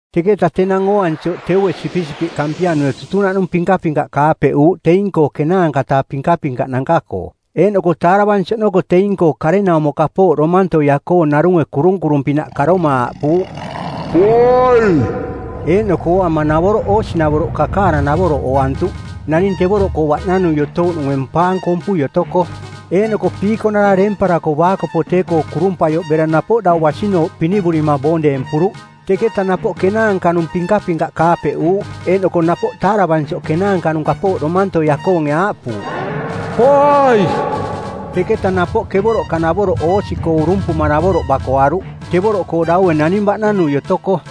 Teketa tenang ooansioꞌ teue sipisipiꞌ kampianue tutunaꞌnung pinkapinkaꞌ kaapeꞌuuꞌ teing-koo ˜kenaanka-taa pinkapinkaꞌnanka-koo, eeꞌnoko taaravansi oꞌnoko teing-koo karenaumo kapooꞌ domantoia-koo narunge kurunkurung-pinaꞌ karoma aaꞌpuuꞌ, “Poai.” Eeꞌnoko ooama navoroꞌ oosinavoroꞌ kakaaranavoroꞌ ooantuꞌ, naning tevoroꞌkoo baꞌnanui otouꞌnunge mpaang kompui otoko. Eeꞌnoko piikonara deemparako baakopo tee-koo kurumpaioꞌ bera napoꞌ dau basinooꞌ pinivurima boong deempuruꞌ. Teketa napoꞌ kenaanka-nung pinkapinkaꞌ kaapeꞌuuꞌ, eeꞌnoko napoꞌ taaravansioꞌ kenaanka-nung kapooꞌ domantoia-koonge aaꞌpuuꞌ, “Poai.” Teketa napoꞌ kevoroꞌka-navoroꞌ oosi-koo urumpuma navoroꞌ bakoaruꞌ, tevoroꞌkoo daue naning baꞌnanui otoko.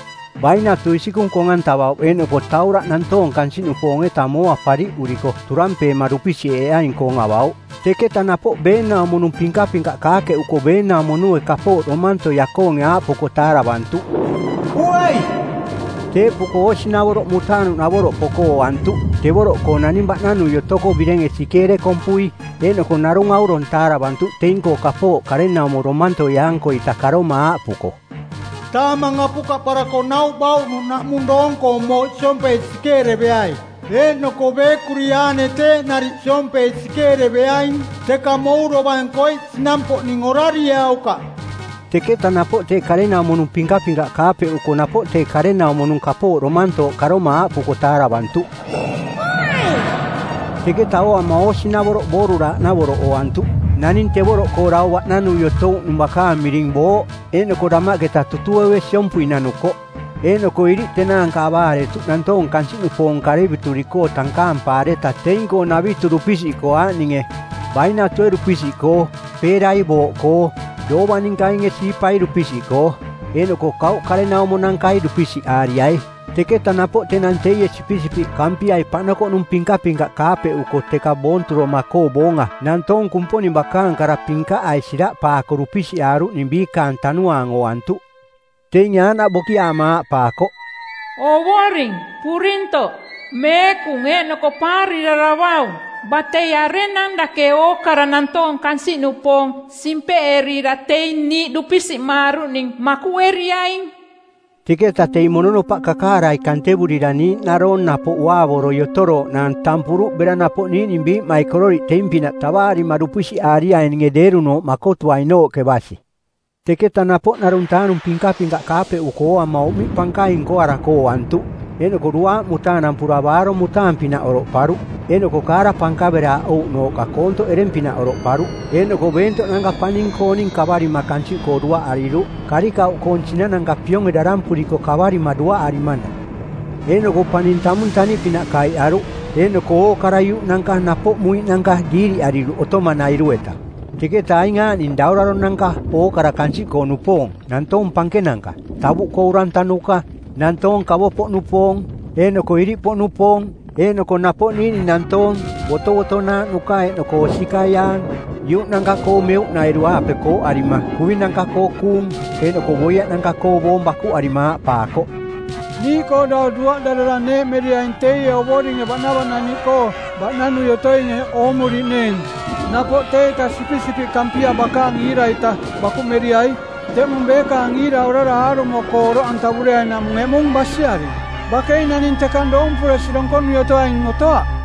Bainatu isikung kong-antavauꞌ eeꞌnoko tauraꞌ nantoong kansiꞌnupoong-eta mooa pariꞌuriko turampeema dupisiꞌeeaing-koong avauꞌ. Teketa napoꞌ beenaumo-nung pinkapinkaꞌ kaakeꞌuko beenaumo-nunge kapooꞌ domantoia-koonge aaꞌpuko taaravantuꞌ, “Poai.” Teeꞌpuko oosinavoroꞌ mutaanuꞌnavoroꞌ poko ooantuꞌ, tevoroꞌkoo naning baꞌnanui otoko birenge sikeere kompui. Eeꞌnoko narung aurong taaravantuꞌ teing-koo kapooꞌ karenaumo domantoia-ankoita karoma aaꞌpuko, “Taamang apukaꞌparako nauꞌ bauꞌnuꞌ naꞌmung doong-koong mooꞌ siompei sikeereveai, eeꞌnoko beekuri aane teeꞌ nariꞌ siompei sikeereveaing, teka mou dovang koiꞌ sinampoꞌning orarieaukaꞌ.” Teketa napoꞌ tee karenaumo-nung pinkapinkaꞌ kaapeꞌuko napoꞌ tee karenaumo-nung kapooꞌ domantooꞌ karoma aaꞌpuko taaravantuꞌ, “Poai.” Teketa ooama oosinavoroꞌ booruraaꞌnavoroꞌ ooantuꞌ. Naning tevoroꞌkoo dau baꞌnanui otouꞌnung bakaang miring Booꞌ. Eeꞌnoko damaꞌketa tutueue siompui nanukoꞌ. Eeꞌnoko iriꞌ tenaanka avaaretuꞌ nantoong kansiꞌnupoong karevituri-koo tankaampaareta teing-koo navitu dupisiꞌkoo aaꞌninge: bainatue dupisiꞌkoo, peerai booꞌkoo, doovaninkainge siipai dupisiꞌkoo eeꞌnoko kauꞌkarenaumo-nankai dupisiꞌaariai. Teketa napoꞌ tenang teie Sipisipiꞌ Kampiai paꞌnokoꞌnung pinkapinkaꞌ kaapeꞌuko teka boonturoma-koo boonga nantoong Kumponing bakaang kara pinkaꞌai siraꞌpaako dupisiꞌaaruꞌning biikaang tanuaang ooantuꞌ. Teinge aaꞌnaꞌ bokiaama aaꞌpaakoꞌ, “Ovoring purintoꞌ, meekung eeꞌnoko paariraravaung, batei arenang dake ookara nantoong kansiꞌnupoong simpeꞌerira teing niiꞌ dupisiꞌmaaruꞌning makuꞌeriaing?” Teketa teing mononopaꞌ kakaarai kantevurira niiꞌnaroong napoꞌ uaavoroi otorooꞌnaang tampuruꞌ bera napoꞌ niiꞌning biiꞌmaikororiꞌ teing-pinaꞌ tavaarima dupisiꞌaariaininge deerunooꞌ makotuainooꞌke basi. Teketa napoꞌ ˜narung-taa-nung pinkapinkaꞌ kaapeꞌuko ooama uꞌmiꞌ pankaing nkoarako ooantuꞌ, eeꞌnoko duaaꞌ mutaanampura baarong mutaanuꞌpinaꞌ oroꞌparuꞌ, eeꞌnoko kaara pankaveraaꞌouꞌnooꞌka koontoꞌ ereng-pinaꞌ oroꞌparuꞌ. Eeꞌnoko beentoꞌnanka paning-kooning kavarima kansiꞌkoo duaꞌariruꞌ, karikauꞌkoong sinananka pionge darampuriko kavarima duaꞌarimanaꞌ. Eeꞌnoko paning tamung taniꞌpinaꞌ kaiꞌaruꞌ, eeꞌnoko ookara iuꞌnanka napoꞌ muiꞌnanka diiriꞌariruꞌ otomanairu-eta. Teketa aing aaꞌning dauraronanka ookara kansiꞌkoo-nupoong, nantoong pankenanka, tavuꞌkoo urantanuka, nantoong kavo-poꞌnupoong, eeꞌnoko iriꞌpoꞌnupoong, eeꞌnoko napoꞌ niiꞌning nantoong, botovotonaaꞌnuka eeꞌnoko osikaiaang, iuꞌnanka-koo meuꞌnairu-aape kooꞌarima kuvinanka-koo kuung eeꞌnoko boiaꞌnanka-koo boong bakuꞌarima aaꞌpaakoꞌ, “Niiꞌkoo dau duaꞌdarara neeꞌmeriai teie Ovoringe baꞌnavaꞌnaniꞌkoo baꞌnanui otoinge oomuriꞌneeng. Napoꞌ teieta Sipisipiꞌ Kampia bakaang iira-ita bakuꞌmeriai. Teꞌmung beekaang iira orara aarumo-koo oroꞌantavureainaꞌmung eꞌmung basiaring. Bakei naning tekang doompuresi donkonui otoaing otoaꞌ!”